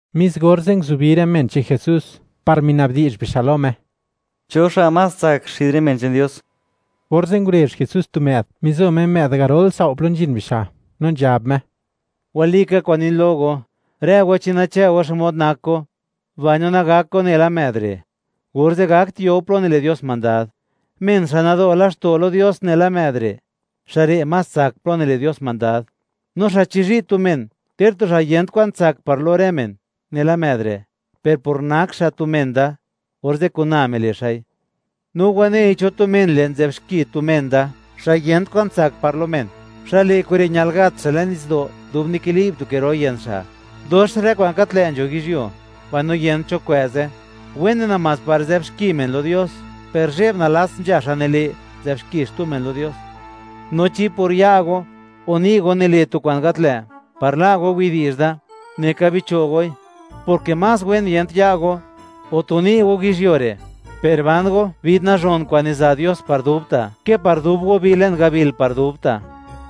Mis orze', nguzubi rë men che'n Jesús, par mina'bdi'zh bixa' lo Me: ―¿Cho xa' más tsak xid rë men che'n Dios? Orze' ngurezh Jesús tu më'd, mizo Me më'd garol sao' plo nzhin bixa', no nzhab Me: ―Walika kwa'n nin lo go, rë go, chi nachë'u xmod nak go, mbaino nagak go nela më'd re', orze' gakt yo go plo nile' Dios mandad. Men xa' nado' laxto' lo Dios nela më'd re', xa' re' más tsak plo nile' Dios mandad, no xa' chizhi' tu men, ter tu xa' yent kwan tsak par lo rë men nela më'd re', per por nak xa' tu men da, orze' kun na mile' xa'i. ’No wanei cho tu men le' zë'b xki tu men da xa' yent kwan tsak par lo men, xa' le' kure' ñal gat xa' le'n nitsdo', dub nikili'b tu ke ro yën xa'. Dox rë kwa'n gat lë' nzho yizhyuo, mbaino yent cho kwë'ze; wene namás par zë'b xki men lo Dios, ¡per zhe'b nalats nzha xa' nile', nzë'b xki xtu men lo Dios! No chi por ya' go o ni' go nile' go tu kwa'n gat lë', par la' go widi'zh da, neka bicho' goi, porke más wen yent ya' go o tu ni' go yizhyuo re', per ban go vid nazhon kwa'n niza' Dios par dubta', ke par dub go bi le'n gabil par dubta'.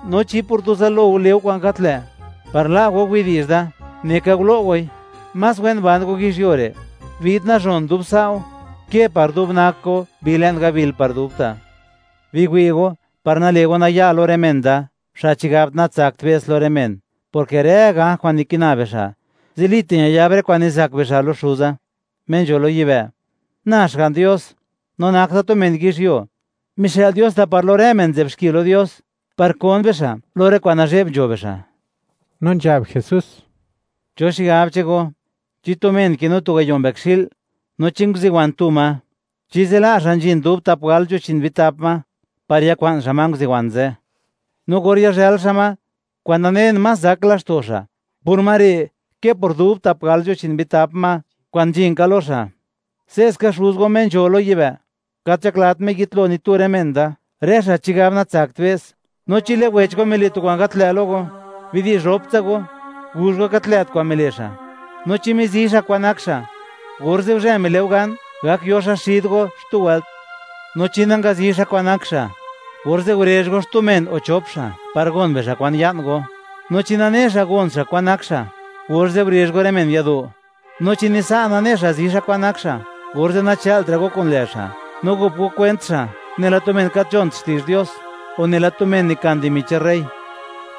No chi por tu zalo go le' go kwa'n le' par la' go widi'zh da, neka gulo' goi; más wen ban go yizhyuo re' vid nazhon dub sa' go ke par dub nak go bi le'n gabil par dubta'. ’Biwi'u, par nale' go naya' lo rë men da, xa' chigab natsakt be's lo rë men, porke rë ganj kwa'n nikina bixa', zilita' ñayab rë kwa'n nizak bixa' lo Xuza, Me nzho lo yibë'. Na, Xga'n Dios, no nak Da tu men yizhyuo, mixë'l Dios Da par lo rë men nzë'b xki lo Dios par kon bixa' lo rë kwa'n nazhe'b nzho bixa'. No nzhab Jesús: ―¿Cho xigab che'n go? Chi tu men kinu tu gayo' mbëkxi'l, no chi nguziwan tu ma, ¿chi zila' xa' nzhin dub tap gal nzho chi'n bitap ma, par yakwa'n xa' ma nguziwan ze'? No or yazhël xa' ma, kwa'n nanen, más zak laxto' xa' por ma re', ke par dub tap gal nzho chi'n bitap ma kwa'n nzhin ka lo xa'. Se'ska Xuz go Me nzho lo yibë', gat nzhaklat Me yitlo ni tu rë men da, rë xa' chigab natsakt be's. ’No chi lë' wech go mile' tu kwa'n gat lë' lo go, bidi'zh roptsa go, guzh go gat lë't kwa'n mile' xa'. No chi mizi xa' kwa'n nak xa', orze' guzhë mile' go gan, gak yo xa' xid go xtu wëlt. No chi nangazi xa' kwa'n nak xa', orze' gurezh go xtu men o xchop xa' par gon bixa' kwan ya'n go. No chi nane xa' gon xa' kwa'n nak xa', orze' gurezh go rë men yado'; no chi ni sa' nane xa' zi xa' kwan nak xa', orze' nachë'lt ra' go kun lë' xa', no gop go kwent xa' nela tu men gat nzhont widi'zh che'n Dios, o nela tu men nikan dimi che'n rey.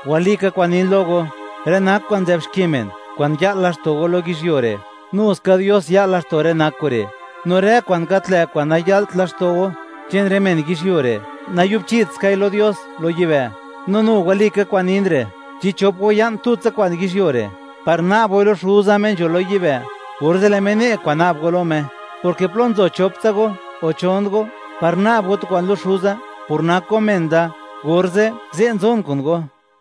’Walika kwa'n nin lo go; rë nak kwa'n nzë'b xki men, kwa'n ya'l laxto' go lo yizhyuo re', nu ska Dios ya'l laxto' rë nak kure'; no rë kwa'n gat lë' kwa'n naya'lt laxto' go che'n rë men yizhyuo re', nayu'bchitskai lo Dios lo yibë'. ’No nu walika kwa'n nin re', chi chop go ya'n tutsa kwa'n yizhyuo re' par na'b goi lo Xuza Me nzho lo yibë', orze' lë' Me ne' kwa'n na'b go lo Me, porke plo nzo chop tsa go o chon go par na'b go tu kwa'n lo Xuza por nak go men Da, orze' ze' nzon kun go.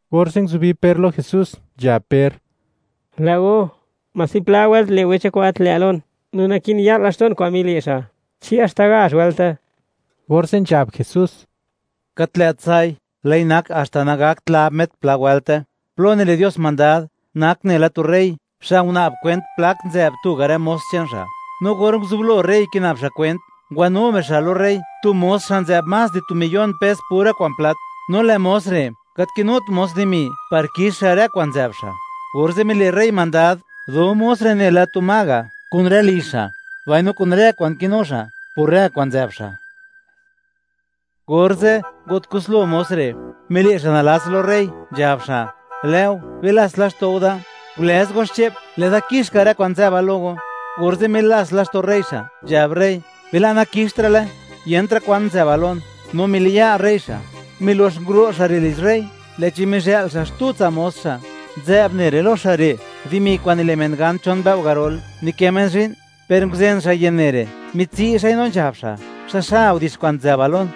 Orze' nguzubi Per lo Jesús, nzhab Per: ―Lë'o, ¿mási pla wëlt le' wecha kwa'n gat lë' lon, no naki'n ya'l laxto'n kwa'n mile' xa'? ¿Chi haxta gazh wëlte? Orze' nzhab Jesús: ―Gat lë't sa'i; lë'i nak haxta nagakt lab met pla wëlte. ’Plo nile' Dios mandad nak nela tu rey xa' nguna'b kwent plak nzë'b tuga' rë mos che'n xa'. No or nguzublo rey kina'b xa' kwent, ngwanu bixa' lo rey tu mos xa' nzë'b más di tu miyon pes pura kwa'n plat. No lë' mos re' gat kinut mos dimi par kix xa' rë kwa'n nzë'b xa', orze' mile' rey mandad, do mos re' nela tu ma ga' kun rë lizh xa', mbaino kun rë kwa'n kinu xa', por rë kwa'n nzë'b xa'. Orze' ngo't kuslo mos re', mile' xa' nalats lo rey, nzhab xa': “Lë'o, bilats laxto' go da, gulëz go xche'p, lë'da kix ka rë kwa'n nzë'ba lo go.” Orze' milats laxto' rey xa', nzhab rey: “Bila' nakixtra'le, yentra' kwan nzë'bal lon”, no miliya' rey xa'. Milox nguro' xa' re' lizh rey, lë'chi mizhë'l xa' xtu tsa' mos xa', nzë'b ne' re' lo xa' re' dimi kwa'n nile' men gan chon mbëo' garol nikë men zhi'n, per nguzen xa' yën ne' re', mitsi' xa'i no nzhab xa': “¡Xaxa udix kwa'n nzë'bal lon!”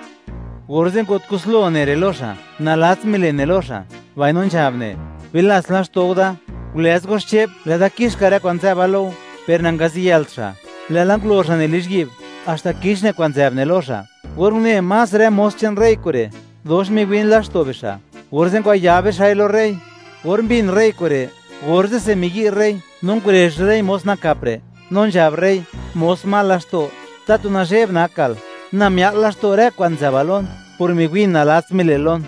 Orze' ngo't kuslo ne' re' lo xa', nalatsa mile' ne' lo xa', mbaino nzhab ne': “¡Bilats laxto' go da, gulëz go xche'p, lë'da kix ka rë kwa'n nzë'ba lo go!” Per nangaziyëlt xa', lë'la ngulo xa' ne' lizhyi'b haxta kix ne' kwa'n nzë'b ne' lo xa'. Or une más rë mos che'n rey kure', dox miwin laxto' bixa', orze' ngwayab bixa'i lo rey. Or mbin rey kure', orze'se miyi' rey no ngurezh rey mos nakap re', no nzhab rey: “¡Mos mal laxto', tatu nazhe'b nakal! Na mia'l laxto' rë kwa'n nzë'bal lon por miwi'n nalats mile'l lon.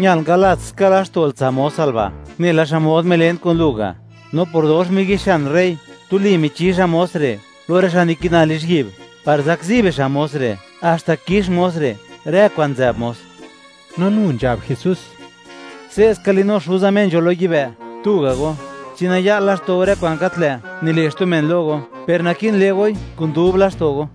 Ñal ngalats ka laxto'l tsa' mosal ba' nela xmod milen kun lu ga'.” No por dox miyi'xian rey, tuli michi xa' mos re' lo rë xa' nikina lizhyi'b par zakzi bixa' mos re' haxta kix mos re' rë kwa'n nzë'b mos. No nu nzhab Jesús: ―Se'ska linu Xuza Me nzho lo yibë', tuga' go, chi naya'l laxto' go rë kwa'n gat lë' nile' xtu men lo go, per naki'n le' goi kun dub laxto' go.